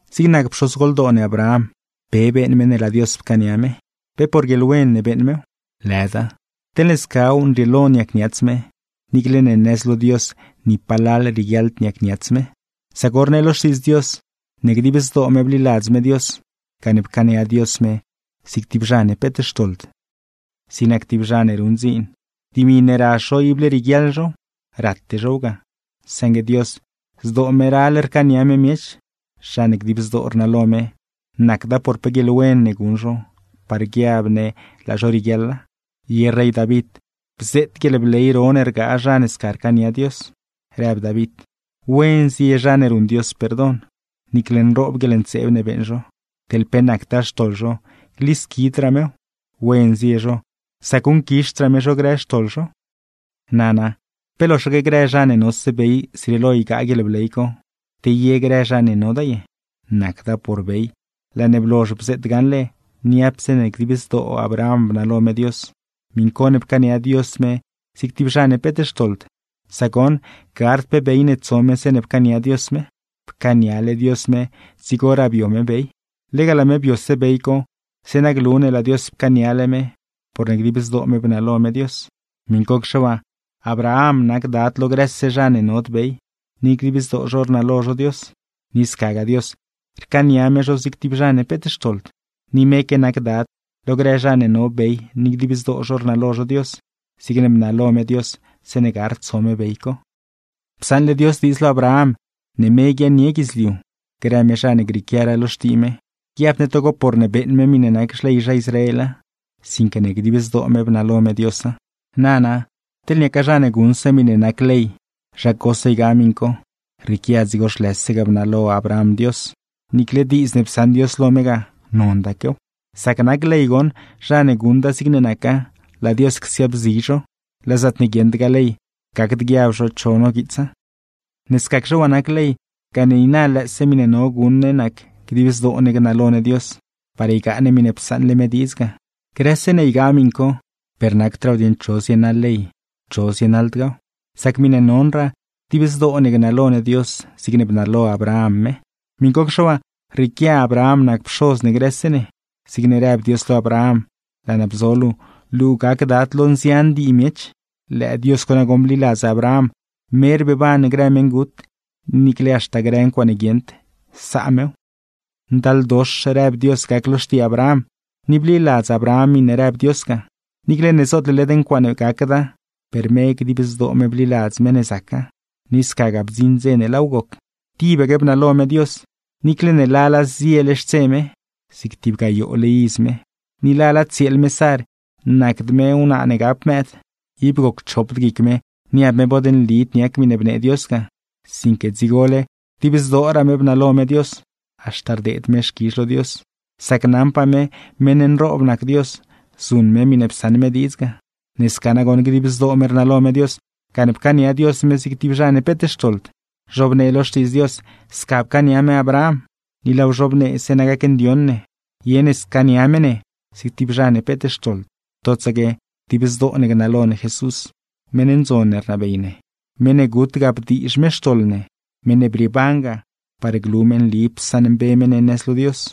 Zig nac pxozgoldoo ne Abraham, ¿pe beeṉ me ne laa Dios pcaania me? ¿Pe por guieḻwen ne beeṉ mew? ¡Lëda! Teḻne scaw, nrieelo niacniats me (niicle ne nëz lo Dios ni palal rieguiaḻd niacniats me). Sac goṉ rnee lo Xtiidz Dios, ne dib zdoo me bliladz me Dios gane pcaania Dios me zig tib zha ne peet xtoḻd. Zig nac tib zha ne ruṉ dziin, dimi ne razh zho ible rieguiaḻ zhow, rate zhow ga. Saṉgue Dios zdoo me ral rcaania me miech, zha ne dib zdoo rnalo me, nacda por pe guieḻwen ne guṉ zho par guiab ne laa zho rieguiaḻa. Ye rey David bzeet guieḻbley ro ne rgaa zha ne sca rcaania Dios, rëb David: ¡Wen zie zha ne ruṉ Dios perdon! Niicle nroob guieḻntseeb ne beeṉ zho; teḻ pe nactaa xtoḻ zho, glisquidraa mew. ¡Wen zie zho sac guṉquizhdraa me zho grë xtoḻ zho! Nana, ¿pe loxaque grë zha ne nose bey zrieelo ygaa guieḻbley co, te ye grë zha ne noda ye? Nacda por bey, laa ne blozh bzeet gaṉle niapse ne dib zdoo Abraham bnalo me Dios, miṉ co ne pcaania Dios me zig tib zha ne peet xtoḻd; sac goṉ gard pe bey ne tso me zeeṉe pcaania Dios me. Pcaaniale Dios me dzigoraa bio me bey. Lega laa me biose bey co, zeeṉa glu ne laa Dios pcaaniale me porne dib zdoo me bnalo me Dios. Miṉcocxe waa, Abraham nac dad lo grëse zha ne nod bey, ni dib zdoo zho rnalo zho Dios; ni scagaa Dios, rcaania me zho zig tib zha ne peet xtoḻd. Ni meque nac dad lo grë zha ne no bey ni dib zdoo zho rnalo zho Dios, zigne bnalo me Dios zeeṉe gard tso me bey co. Psaṉle Dios diidz lo Abraham ne me guiaaṉnie guidzliu, grë me zha ne grieequiaraa lo xtii me; guiabd ne togo porne beeṉ me miṉe nac xley zha Israela, sinque ne dib zdoo me bnalo me Diosa. Nana, teḻ niaca zha ne guṉse miṉe nac ley, zha cose ygaa miṉ co, rrieequia dzigo zhlëse ga bnalo Abraham Dios, niicle diidz ne psaṉ Dios lo me ga, nondaquew. Sac nac ley goṉ, zha ne guṉda zigne naca, laa Dios csiaabzi zho; laa zaatne guieṉdgaa ley, gacd guiab zho cho noguiitsa. Ne scacxe waa nac ley, gane niina lëëse miṉe no guṉ ne nac dib zdoo ne gnalo ne Dios par ygaa ne miṉe psaṉle me diidz ga. Grëse ne ygaa miṉ co, per nacdraaw dieṉ cho zienaḻ ley, cho zienaḻdgaaw, sac miṉe nonraa, dib zdoo ne gnalo ne Dios zigne bnalo Abraham me. Miṉcocxe waa, rrieequia Abraham nac pxoz ne grëse ne, zigne rëb Dios lo Abraham: “Laa naa bzo luu, luu gac dad lo nzian dii miech.” ¡Lëë Dios co nagoṉ bliladz Abraham, me rbeeban grë meṉgut, ni niicle haxta grë ncuaaṉe guieṉd, saa mew! Ndaldox rëb Dios gac lo xtii Abraham, ni bliladz Abraham miṉe rëb Dios ga. Niicle ne zootle led ncuaaṉe gacda, per me dib zdoo me bliladz me ne zaca, ni scagaa bdziṉ dze ne laaw goc. Tibaque bnalo me Dios, niicle ne lala ziele xtse me (zig tib gayoole iz me), ni lala tsieel me Sar, nacd me wnaa ne gap mëëd. Ib goc chopd guic me niab me bod nlid niac miṉe bnee Dios ga, sinque dzigole dib zdooraa me bnalo me Dios; haxta rdeed me xquizh lo Dios, sac naṉpaa me meṉ nroob nac Dios zuṉ me miṉe psaṉ me diidz ga. Ne sca nagoṉ dib zdoo me rnalo me Dios, gane pcaania Dios me zig tib zha ne peet xtoḻd. Zhobnee lo Xtiidz Dios sca pcaania me Abraham, ni laaw zhobnee zeeṉa gacndioṉ ne ye ne scaania me ne zig tib zha ne peet xtoḻd, totsaque dib zdoo ne gnalo ne Jesús, meṉ ndzon ne rnabey ne; meṉ ne gut ga bdiizh me xtoḻ ne, meṉ ne brieeban ga, par glu me nli psaṉmbe me ne nëz lo Dios.